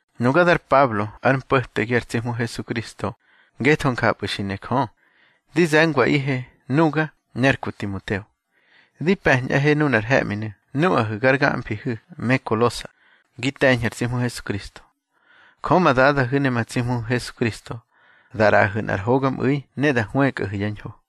Nuga dar Pablo, ár mpo̱tegi ar tsi Hmu Hesukristo ngetho njapꞌu̱ xi ne Jö. Di ze̱ngwaꞌihe, nuga ne ar ku Timoteo. Di pe̱ñꞌahe nunar he̱ꞌminu̱ nuꞌahu̱ gar gamfihu̱ me Kolosa, gi te̱ñhu̱ ar tsi Hmu Hesukristo. Jö ma Dadahu̱ ne ma tsi Hmuhu̱ Hesukristo da ꞌraꞌahu̱ nꞌar hogamꞌu̱i ne da hwëkꞌahu̱ yá ñho.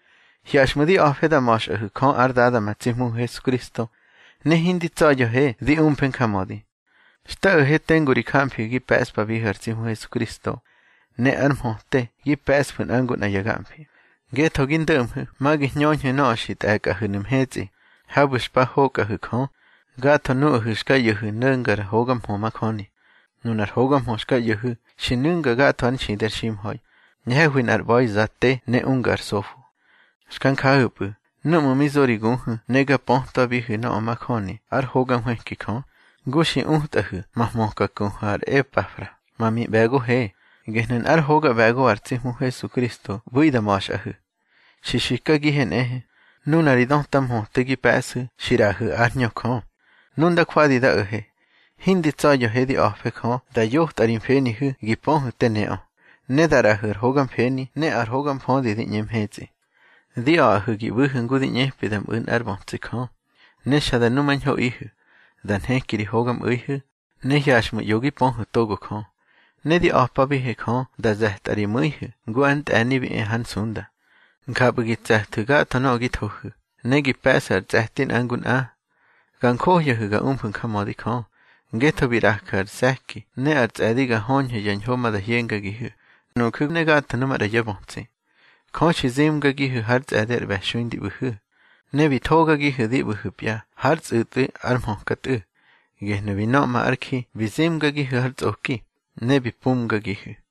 Hyaxꞌmu̱ di a̱fe da ma̱xꞌahu̱ Jö ár Dada ma tsi Hmuhu̱ Hesukristo, ne hindi tsa̱ya̱he di umfe njamödi. Xta o̱he tengu ri jamfihu̱ gi pe̱ꞌspabihu̱ ar tsi Hmu Hesukristo, ne ar mhöte gi pe̱ꞌsfu̱ nꞌa ngu nꞌa ya gamfi, ngetho gi ndo̱ꞌmhu̱ ma gi hñöñhu̱ nöꞌö xi tꞌe̱kꞌahu̱nu̱ mhetsꞌi, habu̱ xpa hokꞌahu̱ Jö, gatho nuꞌahu̱ xka ꞌyo̱hu̱ no̱ngar hoga mhö majöni. Nunar hoga mhö xka ꞌyo̱hu̱ xi nu̱nga gatho ár nxidi ar ximha̱i, ñhe̱hwi nꞌar ꞌba̱iza te ne unga ar sofo. Xka njahu̱pꞌu̱ núꞌmu̱ mi zo ri guhu̱ ne ga pötwabihu̱ nöꞌö majöni ár hoga nhwëki Jö, ngu xi utꞌahu̱ ma hmöka kuhu̱ ar Epafra, ma miꞌbe̱gohe. Gehnu̱ nꞌár hoga ꞌbe̱go ar tsi Hmu Hesukristo ꞌbu̱i da ma̱xꞌahu̱. Xi xikagihe nꞌehe, nuna ri döta mhöte gi pe̱ꞌsu̱ xi ꞌraꞌahu̱ ár Hñö Jö. Nu nda jwadi da o̱he, hindi tsa̱ya̱he di a̱fe Jö da yotꞌa ri mfenihu̱ gi pöhu̱ te neꞌö, ne da ꞌraꞌahu̱ ar hoga mfeni ne ar hoga mfödi di ꞌñe mhetsꞌi. Di a̱ꞌahu̱ gi ꞌbu̱hu̱ ngu di ꞌñepi da mꞌu̱ nꞌár bötsi Jö, ne xa da numañhoꞌihu̱. Da nheki ri hogamꞌu̱ihu̱, ne hyaxꞌmu̱ ꞌyo gi pöhu̱ togo Jö. Ne di a̱pabihe Jö da ze̱tꞌa ri mu̱ihu̱ ngu ár ntꞌe̱ni bi e hár nsunda. Njapꞌu̱ gi tse̱thu̱ gatho nöꞌö gi thohu̱, ne gi pe̱ꞌsu̱ ar tsꞌe̱ti nꞌa ngu nꞌa. Ga njohyahu̱ ga umfu̱ njamödi Jö, ngetho bi ꞌraju̱ ar se̱ki ne ar tsꞌe̱di ga höñhu̱ ya ñho ma da hyengagihu̱, nuju̱ ne gatho nu maꞌra yá bötsi. Jö xi zimgagihu̱ hár tsꞌe̱di ar ꞌbe̱xui ndi ꞌbu̱hu̱, ne bi thógagihu̱ di ꞌbu̱hu̱pya hár tsꞌu̱tꞌwi ár hmöka Tꞌu̱. Gehnu̱ bi nöꞌma ár ji bi zimgagihu̱ har tsꞌoki, ne bi pumgagihu̱.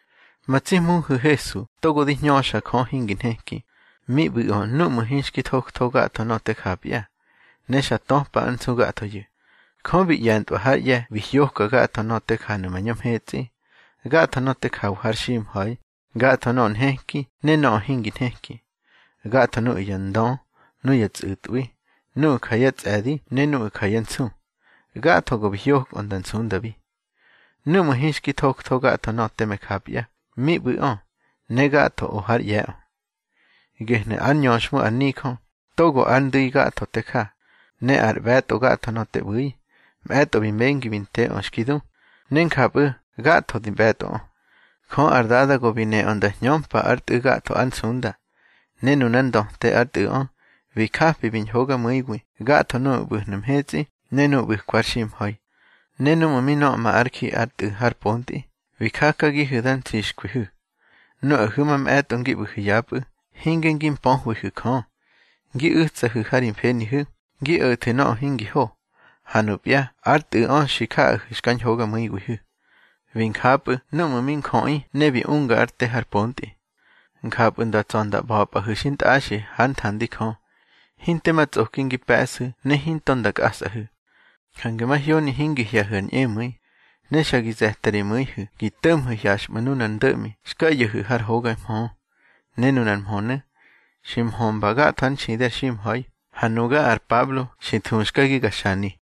Ma tsi Hmuhu̱ Hesu togo di hñöxa Jö hingi nheki, mi ꞌbu̱ꞌö núꞌmu̱ hinxki thoktho gatho nöꞌö te japya, ne xa töpa ár nsu gathoyu̱. Jö bi ꞌye̱ntꞌwa hár ꞌye̱ bi hyoka gatho nöꞌö te janu̱ mañö mhetsꞌi, gatho nöꞌö te jawa har ximha̱i, gatho nöꞌö nheki ne nöꞌö hingi nheki, gatho nuꞌu̱ ya ndö, nuya tsꞌu̱tꞌwi, nuꞌu̱ ja yá tsꞌe̱di ne nuꞌu̱ ja yá nsu. Gatho go bi hyokꞌö nda nsundabi. Núꞌmu̱ hinxki thoktho gatho nöꞌö teme japya, mi ꞌbu̱ꞌö, ne gatho o hár ꞌye̱ꞌö. Gehnu̱ ár ñöxhmu ar nijö, togo ár ndu̱i gatho te ja, ne ar ꞌbe̱tꞌo gatho nöꞌö te ꞌbu̱i. Mꞌe̱tꞌo bi mengi bi nteꞌö xki du, ne njapꞌu̱ gatho di ꞌbe̱tꞌoꞌö. Jö ar Dada go bi neꞌö nda hñömpa ár Tꞌu̱ gatho ár nsunda. Ne nunár ndöte ár Tꞌu̱ꞌö, bi japi bi ñhogamu̱iwi gatho nuꞌu̱ ꞌbu̱hnu̱ mhetsꞌi ne nuꞌu̱ ꞌbu̱kwa har ximha̱i. Ne núꞌmu̱ mi nöꞌma ár ji ár Tꞌu̱ har pontꞌi, bi jakagihu̱ da ntsixkwihu̱. Nuꞌahu̱ mamꞌe̱tꞌo ngi ꞌbu̱hu̱ yapꞌu̱, hinge ngi mpöhwihu̱ Jö. Ngi u̱tsahu̱ ha ri mfenihu̱, ngi o̱thu̱ nöꞌö hingi ho. Ha nupya ár Tꞌu̱ꞌö xi jaꞌahu̱ xka ñhogamu̱iwihu̱. Bi njapꞌu̱ núꞌmu̱ mi njöꞌi ne bi unga ár te har pontꞌi. Njapꞌu̱ nda tsa̱ nda ꞌba̱pꞌahu̱ xintꞌaxi hár nthandi Jö, hinte ma tsꞌoki ngi pe̱ꞌsu̱ ne hinto nda kꞌasꞌahu̱. Jange mahyoni hingi hye̱hu̱ ar ñꞌemu̱i, ne xa gi ze̱ta ri mu̱ihu̱ gi to̱ꞌmhu̱ hyaxꞌmu̱ nunar ndo̱ꞌmi xka ꞌyo̱xu̱ har hoga mhö. Ne nunar mhönu̱ xi mhömba gatho ár nxidi ar ximha̱i, ha nuga ar Pablo xi thuxkagi ga xani.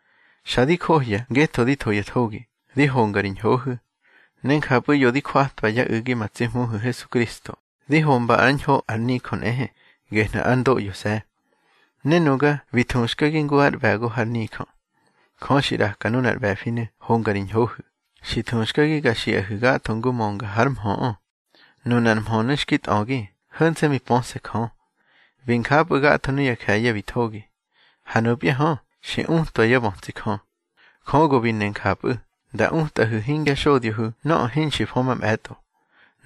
Xa di johya ngetho di tho ya thogi, di honga ri ñhohu̱. Ne njapꞌu̱ ꞌyo di jwatwa yá u̱gi ma tsi Hmuhu̱ Hesukristo, di homba ár ñho ar nijö nꞌehe, gehnu̱ ár ndoꞌyose̱. Ne nuga bi thuxkagi ngu ár ꞌbe̱go hár nijö. Jö xi ꞌraka nunar ꞌbe̱finu̱ honga ri ñhohu̱. Xi thuxkagi ga xiꞌahu̱ gatho ngu mönga hár mhöꞌö. Nunar mhönu̱ xki tꞌögi, ho̱nse̱ mi pöse̱ Jö. Bi njapꞌu̱ gatho nuya je̱ye̱ bi thogi, ha nupya hö, xi utwa yá bötsi Jö. Jö go bi ne njapꞌu̱, nda utꞌahu̱ hingya xodyohu̱ nöꞌö hinxki fö mamꞌe̱tꞌo: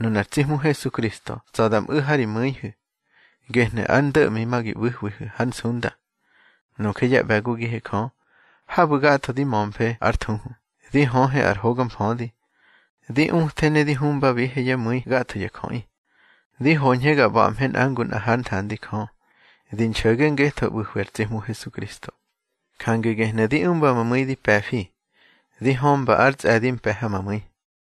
nunar tsi Hmu Hesukristo tsa̱ da mꞌu̱ ha ri mu̱ihu̱. Gehnu̱ ar ndo̱ꞌmi ma gi ꞌbu̱hwihu̱ hár nsunda. Nuje yá ꞌbe̱gogihe Jö, habu̱ gatho di mömfe ár thuhu, di höhe ar hoga mfödi. Di uthe ne di huꞌmbabihe yá mu̱i gatho ya jöꞌi, di hoñhe ga ꞌba̱ꞌmhe nꞌa ngu nꞌa hár nthandi Jö, di nxo̱ge ngetho ꞌbu̱hwi ar tsi Hmu Hesukristo. Jange gehnu̱ di umba ma mu̱i di pe̱fi, di hömpa ár tsꞌe̱di mpe̱ ha ma mu̱i.